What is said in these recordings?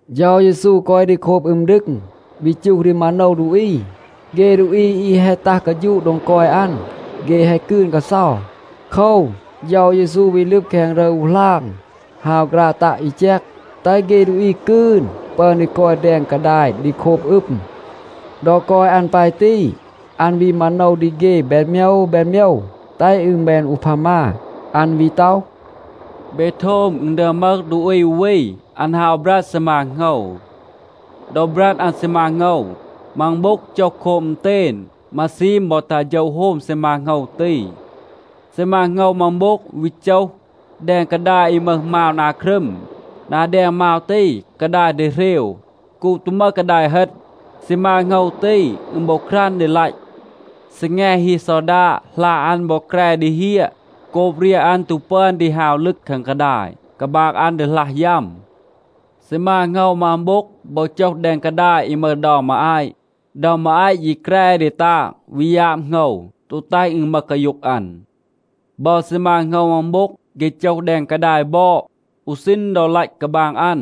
เฌา เยซู กอย ดี โคบ อึม ดึง, วี จูห ดี มาโนว ดูอี. เฆ ดูอี อี แฮะ ตัห กาฌูะ โดง กอย อัน, เฆ แฮะ กืน กาเซา. โคว, เฌา เยซู วี ลึบ แคง รึร อู หลาง, ฮาว ฆราะ ตัะ อี แจก, แตห เฆ ดูอี กืน ปึอน ดี กอย แดง กาดาย ดี โคบ อึม. ดอ กอย อัน ปาย ตี, อัน วี มาโนว ดี เฆ แบน โมยว แบน โมยว, แตห อึณ แบน อูพามา. อัน วี ต็อห, “เบ โทม. อึณ ดึอม มึห ดูอี อู วี, อัน ฮาว บรัด ซีมา โหงว. ดอ บรัด อัน ซีมา โหงว, มัง โบ็ง โจห โคบ อึณเตณ. มาซีม บอ ตัห โฌะ โฮม ซีมา โหงว ตี. ซีมา โหงว มัง โบ็ง วี โจห แดง กาดาย อี มึห มาว นา ครึม. นา แดง มาว ตี กาดาย ดีเหรว. โกบ ตู มึห กาดาย เฮต, ซีมา โหงว ตี, อึณ บอ ครัน ดี ลัต. ซีแง ฮี ซอดาด, หลา อัน บอ แกร ดี เฮียะ โกบ เรียห อัน ตู ปึอน ดี ฮาว ลึก แคง กาดาย, กาบาง อัน ดีหลัห ยัม. ซีมา โหงว มัง โบ็ง, บอ โจห แดง กาดาย อี มึห เดา มาอาต. เดา มาอาต ยี แกร ดี ตาง, วี ยาบ โหงว, ตู แตห อึณ มึห กาโย็ง อัน. บอ ซีมา โหงว มัง โบ็ง, เฆ โจห แดง กาดาย บอด. อู ซีณ ดอ เลห กาบาง อัน,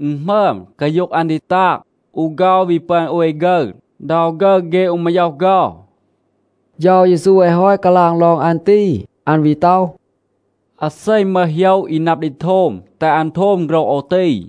อึณ หมึอม. กาโย็ง อัน ดี ตาง. อู เฆา, วี ปึอน โอย ฆึร, เดา ฆึร เฆ อู มาย็อห เฆา.” เฌา เยซู แฮะ ฮอต กาลาง ลอง อัน ตี, อัน วี ต็อห, “อาเซ มึห โหยะ อี นับ ดี โทม, แตห อัน โทม โฆรห โอว ตี.”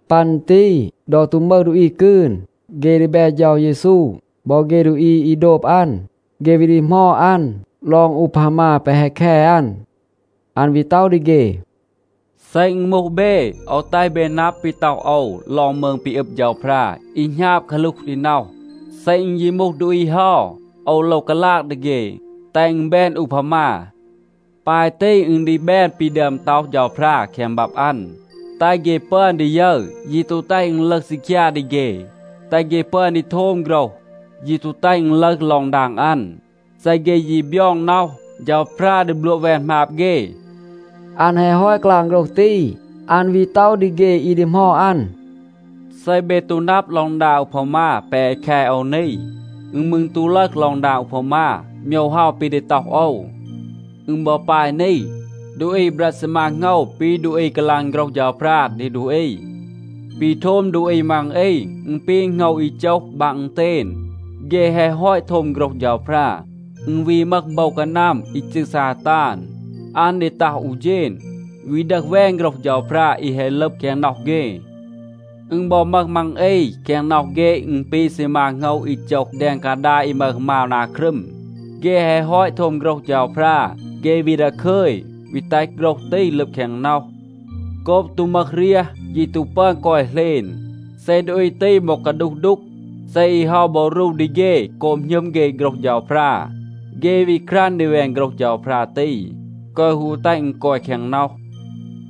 ปัน ตี ดอ ตู มึห ดูอี กืน, เฆ ดีแบ เฌา เยซู บอ เฆ ดูอี อี โดบ อัน, เฆ วี ดีหมอด อัน ลอง อูพามา แปะ แฮะ แค อัน. อัน วี ต็อห ดี เฆ, “เซ อึณ มูห เบ, โอว แตห เบ นับ ปี ต็อห โอว ลอง มืง ปี อึบ เฌาพรา อี หณาบ กาหลูห ดี น็อห. เซ อึณ ยี มูห ดูอี เฮา, โอว โลว กาลาง ดี เฆ, แตห อึณ แบน อูพามา. ปาย ตี อึณ ดี แบน ปี ดึอม ต็อห เฌาพรา แคง บับ อัน. แตห เฆ ปึอน ดี ยึร, ยี ตู แตห อึณ ลึห ซีคยา ดี เฆ. แตห เฆ ปึอน ดี โทม โฆรห, ยี ตู แตห อึณ ลึห ลอง ดาง อัน. เซ เฆ ยี บยอง น็อห, เฌาพรา ดี บลัวะ แวน หมาบ เฆ.” อัน แฮะ ฮอต กาลาง โฆรห ตี, อัน วี ต็อห ดี เฆ อี ดีหมอด อัน, “เซ เบ ตู นับ ลอง ดาง อูพามา แปะ แฮะ แค โอว นี, อึณ มืร ตู ลึห ลอง ดาง อูพามา โมยว เฮา ปี ดี ต็อห โอว. อึณ บอ ปาย นี. ดูอี บรัด ซีมา โหงว ปี ดูอี กาลาง โฆรห เฌาพรา ดี ดูอี. ปี โทม ดูอี มัง อี, อึณ ปี โหงว อี โจห บาง อึณเตณ. เฆ แฮะ ฮอต โทม โฆรห เฌาพรา, อึณ วี มึห โบว กานัม อี จืร ซาตาน, อัน ดี ตัห อู เฌณ, วี ดึห แวน โฆรห เฌาพรา อี แฮะ ลึบ แคง น็อห เฆ. อึณ บอ มึห มัง อี, แคง น็อห เฆ อึณ ปี ซีมา โหงว อี โจห แดง กาดาย อี มึห มาว นา ครึม. เฆ แฮะ ฮอต โทม โฆรห เฌาพรา, เฆ วี ดาคึย, วี แตห โฆรห ตี ลึบ แคง น็อห. โกบ ตู มึห เรียห, ยี ตู ปึอน กอย เหลณ. เซ ดูอี ตี บอ กาดูห ดูก, เซ อี เฮา บอ รู ดี เฆ โกบ หณึม เฆ โฆรห เฌาพรา, เฆ วี ครัน ดี แวน โฆรห เฌาพรา ตี, แกวะ ฮู แตห อึณ กอย แคง น็อห.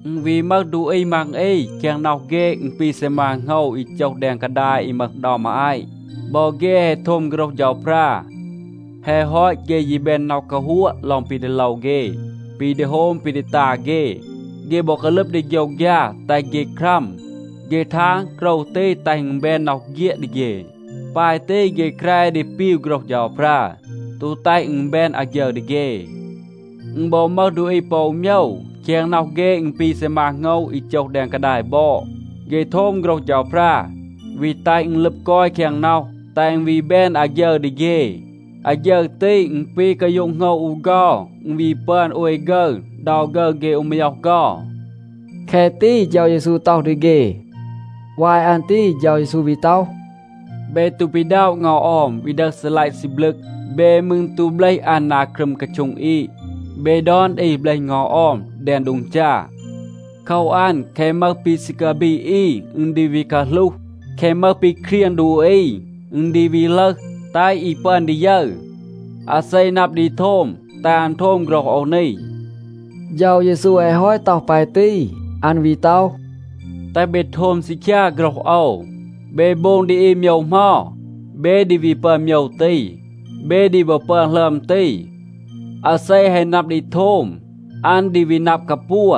อึณ วี มึห ดูอี มัง อี, แคง น็อห เฆ อึณ ปี ซีมา โหงว อี โจห แดง กาดาย อี มึห เดา มาอาต. บอ เฆ แฮะ โทม โฆรห เฌาพรา. แฮะ ฮอต, เฆ ยี แบน น็อห กาฮัวะ ลอง ปี ดี โลว เฆ, ปี ดี โฮม ปี ดี ตา เฆ. เฆ บอ กาลึบ ดี โฆยวฆยา แตห เฆ ครัม. เฆ ทาง, โกรว ตี แตห อึณ แบน น็อห เฆียด ดี เฆ. ปาย ตี เฆ แกร ดี ปีว โฆรห เฌาพรา, ตู แตห อึณ แบน อาฆยึร ดี เฆ. อึณ บอ มึห ดูอี ปอ อู โมยว. แคง น็อห เฆ, อึณ ปี ซีมา โหงว อี โจห แดง กาดาย บอด. เฆ โทม โฆรห เฌาพรา, วี แตห อึณ ลึบ กอย แคง น็อห, แตห อึณ วี แบน อาฆยึร ดี เฆ. อาฆยึร ตี, อึณ ปี กาโย็ง โหงว อู เฆา. อึณ วี ปึอน โอย ฆึร, เดา ฆึร เฆ อู มาย็อห เฆา.” แคะ ตี เฌา เยซู ต็อห ดี เฆ. วาย อัน ตี เฌา เยซู วี ต็อห, “เบ ตู ปีด็อะ เงา ออม, วี ดึห ซีลัยะ ซีบลึก. เบ มืร ตู เบลห อัน นา ครึม กาโช็ง อีด. เบ ดอน อี เบลห เงา ออม แดง โดง จา. โคว อัน, แคะ มึห ปี ซี กาบีด อี, อึณ ดี วี กาหลูห. แคะ มึห ปี เครียง ดูอี, อึณ ดี วี ลึห, แตห อี ปึอน ดี ยึร. อาเซ นับ ดี โทม, แตห อัน โทม โฆรห โอว นี.” เฌา เยซู แฮะ ฮอต ต็อห ปาย ตี, อัน วี ต็อห, “แตห เบ โทม ซีคยา โฆรห โอว. เบ โบง ดี อี โมยว เหมา, เบ ดี วี ปึอน โมยว ตี. เบ ดี บอ ปึอน หลึอม ตี. อาเซ แฮะ นับ ดี โทม, อัน ดี วี นับ กาปัว,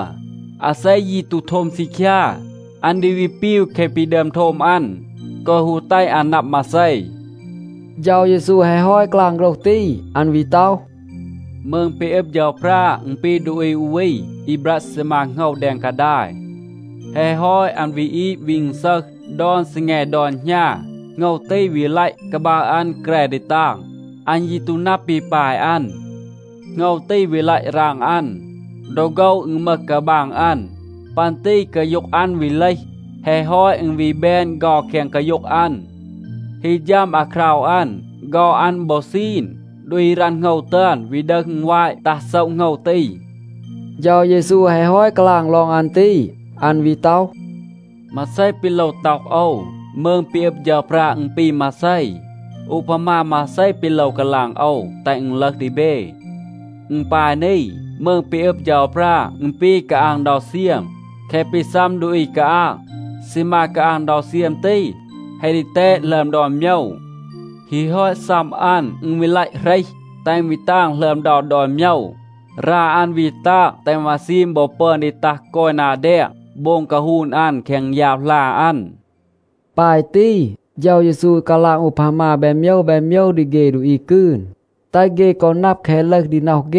อาเซ ยี ตู โทม ซีคยา, อัน ดี วี ปีว แคะ ปี ดึอม โทม อัน, แกวะ ฮู แตห อัน นับ มาเซ.” เฌา เยซู แฮะ ฮอต กาลาง โฆรห ตี, อัน วี ต็อห, “มืง ปี อึบ เฌาพรา, อึณ ปี ดูอี อู วี, อี บรัด ซีมา โหงว แดง กาดาย. แฮะ ฮอต, อัน วี อีด วี อึณซึห. ดอน ซีแง ดอน หณา, โหงว ตี วี ลัต. กาบาง อัน แกร ดี ตาง. อัน ยี ตู นับ ปี ปาย อัน. โหงว ตี วี ลัต ราง อัน. ดอ โฆว อึณ มึห กาบาง อัน. ปัน ตี กาโย็ง อัน วี เลห. แฮะ ฮอต, อึณ วี แบน เฆา แคง กาโย็ง อัน. ฮี ฌัม อาคราว อัน, เฆา อัน บอ ซีน, ดูอี รัณ โหงว ตึอน วี ดึห อึณวาต ตัห โซะ โหงว ตี.” เฌา เยซู แฮะ ฮอต กาลาง ลอง อัน ตี, อัน วี ต็อห, “มาเซ ปี โลว ต็อห โอว? มืง ปี อึบ เฌาพรา, อึณ ปี มาเซ? อูพามา มาเซ ปี โลว กาลาง โอว, แตห อึณ ลึห ดี เบ? อึณ ปาย นี. มืง ปี อึบ เฌาพรา, อึณ ปี กาอาง เดา เซียม. แคะ ปี ซัม ดูอี กาอาง, ซีมา กาอาง เดา เซียม ตี แฮะ ดีแตด หลึอม ดอน โมยว. ฮี ฮอต ซัม อัน, อึณ วี ลัต เหรห, แตห อึณ วี ตาง หลึอม เดา ดอน โมยว. รา อัน วี ตาง, แตห มาซีม บอ ปึอน ดี ตัห กอย นา แดง, โบง กาฮูน อัน แคง ยาบ หลา อัน.” ปาย ตี เฌา เยซู กาลาง อูพามา แบน โมยว แบน โมยว ดี เฆ ดูอี กืน, แตห เฆ กอ นับ แคะ ลึห ดี น็อห เฆ.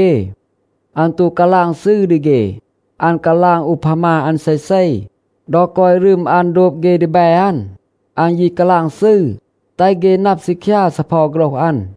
อัน ตู กาลาง ซืร ดี เฆ. อัน กาลาง อูพามา อัน เซเซ. ดอ กอย รึม อัน โดบ เฆ ดีแบ อัน, อัน ยี กาลาง ซืร, แตห เฆ นับ ซีคยา ซีเพา โฆรห อัน.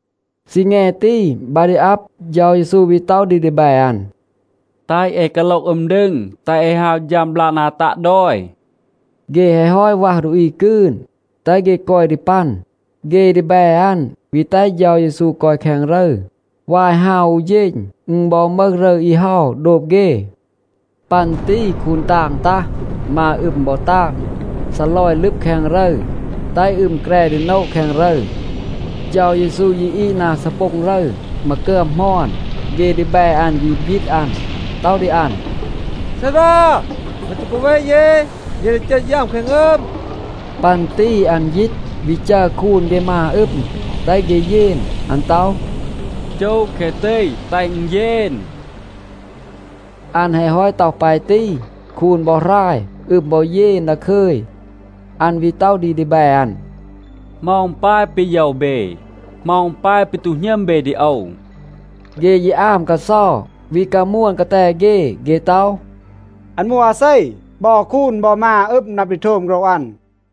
ซีแง ตี, บา ดี อับ, เฌา เยซู วี ต็อห ดี ดีแบ อัน, “แตห เอ กาโลห อึม ดึง, แตห เอ ฮาว ฌัม บลาก นา ตัะ ดอย.” เฆ แฮะ ฮอต วัห ดูอี กืน, แตห เฆ กอย ดี ปัน, เฆ ดีแบ อัน วี แตห เฌา เยซู กอย แคง รึร, วาย ฮาว อู เฌณ. อึณ บอ มึห รึร อี เฮา โดบ เฆ. ปัน ตี คูน ตาง ตัห. มา อึม บอ ตาง, ซีลอย ลึบ แคง รึร, แตห อึม แกร ดี โนะ แคง รึร. เฌา เยซู ยี อีด นา ซีโป็ง รึร, มากึอม หมอน. เฆ ดีแบ อัน วี บยีต อัน, ต็อห ดี อัน, “ซารา, แม ตู กาเว เย? เย ดี เจต ยัม แคง อึม.” ปัน ตี อัน ยีต, วี จัร คูน เฆ มา อึม, แตห เฆ เยน. อัน ต็อห, “จู แคะ ตี, แตห อึณ เยน.” อัน แฮะ ฮอต ต็อห ปาย ตี, คูน บอ หราย. อึม บอ เยน ดาคึย. อัน วี ต็อห ดี ดีแบ อัน, “เหมา อึณ ปาย ปี โยว เบ? เหมา อึณ ปาย ปี ตู หณึม เบ ดี โอว?” เฆ ยี อาม กาเซา, วี กามวน กาแต เฆ. เฆ ต็อห, “อัน มูห อาเซ? บอ คูน บอ มา อึม นับ ดี โทม โฆรห อัน.”